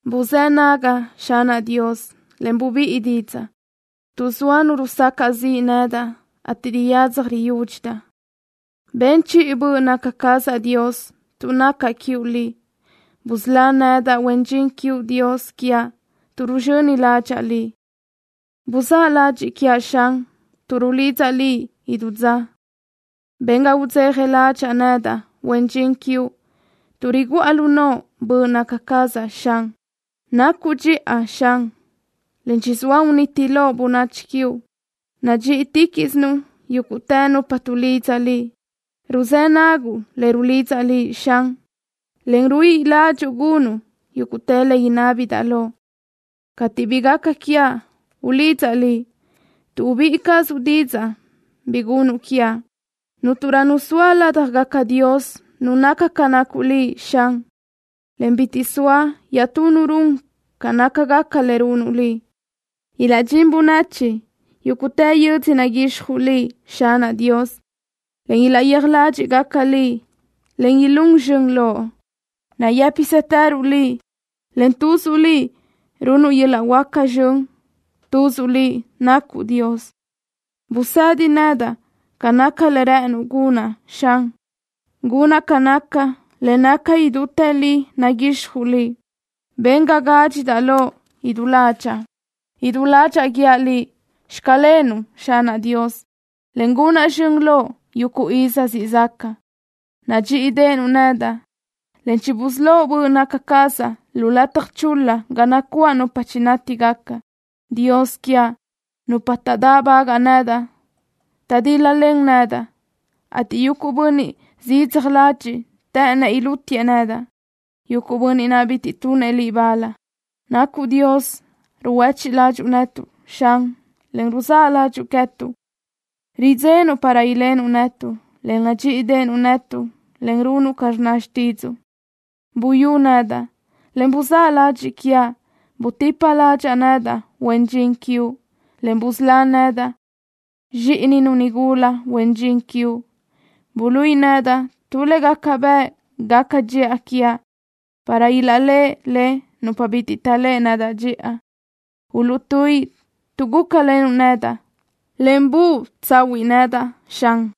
Ruzë́ naguʼ, Xanaʼ Dios, en rubíʼu didzaʼ, tuʼ zoa nu rusacaʼ ziʼ nedaʼ, ateʼ riyadzaj riyúdxidaʼ. Ben chiʼi böʼ naca cazaʼ, Dios, tuʼ nacaʼ quiuʼ Liʼ. Busölá nedaʼ, huen dxin quiuʼ, Dios quiaʼ, tuʼ ruzxöni ládxaʼa Liʼ. Buzáʼ ladxiʼ quiaʼ, Xan, tuʼ rulidzaʼ Liʼ idú dza. Ben ga udzeja ládxaʼa nedaʼ, huen dxin quiuʼ, tuʼ riguʼa lu noʼo böʼ naca cazaʼ, Xan. Nacuʼ dxiʼa, Xan, en chizúʼ uniti loʼ bönachi quiuʼ. Nadxíʼiticaʼsuʼ yúguʼtë nupa tuʼlidza Liʼ. Ruzë́ naguʼ le rulidzaʼ Liʼ, Xan, en ruíʼi ládxuʼu gunuʼ yuguʼ le inábidaʼ loʼ. Cateʼ bi gaca quiaʼ ulidzaʼ Liʼ, tuʼ ubíʼi cazuʼ didzaʼ bi gunuʼ quiaʼ. Cúnturö nu zoa ládjagaca dios nu naca ca nacuʼ Liʼ, Xan, en bitiʼ zoa iaʼtú nu run ca nácagaca le runuʼ Liʼ. Ilaʼdxín bönachi yúguʼtë yödzö naguixjuʼ Liʼ, Xanaʼ Dios, en ilaʼyéaj ládxiʼgaca Liʼ, en ilún zxön Loʼ. Nayë́pisëtërösuʼ Liʼ, en tuzuʼ Liʼ runuʼ yuguʼ yöl-laʼ huáca zxön. Tuzuʼ Liʼ nacuʼ Dios. Busëdi nedaʼ ca naca le rë́ʼënuʼ gunaʼ, Xan. Gunaʼ ca naca le naca idútë li naguixjuʼ Liʼ. Ben ga gádxidaʼ Loʼ idú ládxaʼa. Idú ládxaʼa guíaʼ Liʼ: “Xclenuʼ”, Xanaʼ Dios, en gunaʼ zxön Loʼ yuguʼ iz siʼ zaca. Nadxíʼideʼenuʼ nedaʼ, en chibusölóʼ böʼ naca cazaʼ lu lataj chul-la ga nacuáʼ nupa chinátigaca. Dios quiaʼ, nupa taʼdáʼbagaʼ nedaʼ taʼdíl-lalen nedaʼ, ateʼ yuguʼ bönniʼ zidzaj ladxiʼ të́ʼënëʼ ilútiëʼ nedaʼ, yuguʼ bönniʼ naʼ bitiʼ tunëʼ Liʼ bal. Nacuʼ Dios ruhuéchiʼ ládxuʼu netuʼ, Xan, en ruzáʼ ládxuʼu queë́tuʼ. Ridzenuʼ para ilenuʼ netuʼ, en nadxíʼideʼenuʼ netuʼ, en runuʼ ca rnna xtídzuʼu. Buyú nedaʼ, en buzáʼ ladxiʼ quiaʼ. Butipa ládxaʼa nedaʼ, huen dxin quiuʼ, en busölá nedaʼ, zxíʼininu nigula huen dxin quiuʼ. Buluíʼi nedaʼ tu le gaca bëʼ gaca dxiʼa quiaʼ, para ilaʼléʼe le nupa bitiʼ taʼléʼe nedaʼ dxiʼa. Uluʼtuíʼi, tuʼ gúcalenuʼ nedaʼ, en buë tsahúʼu nedaʼ, Xan.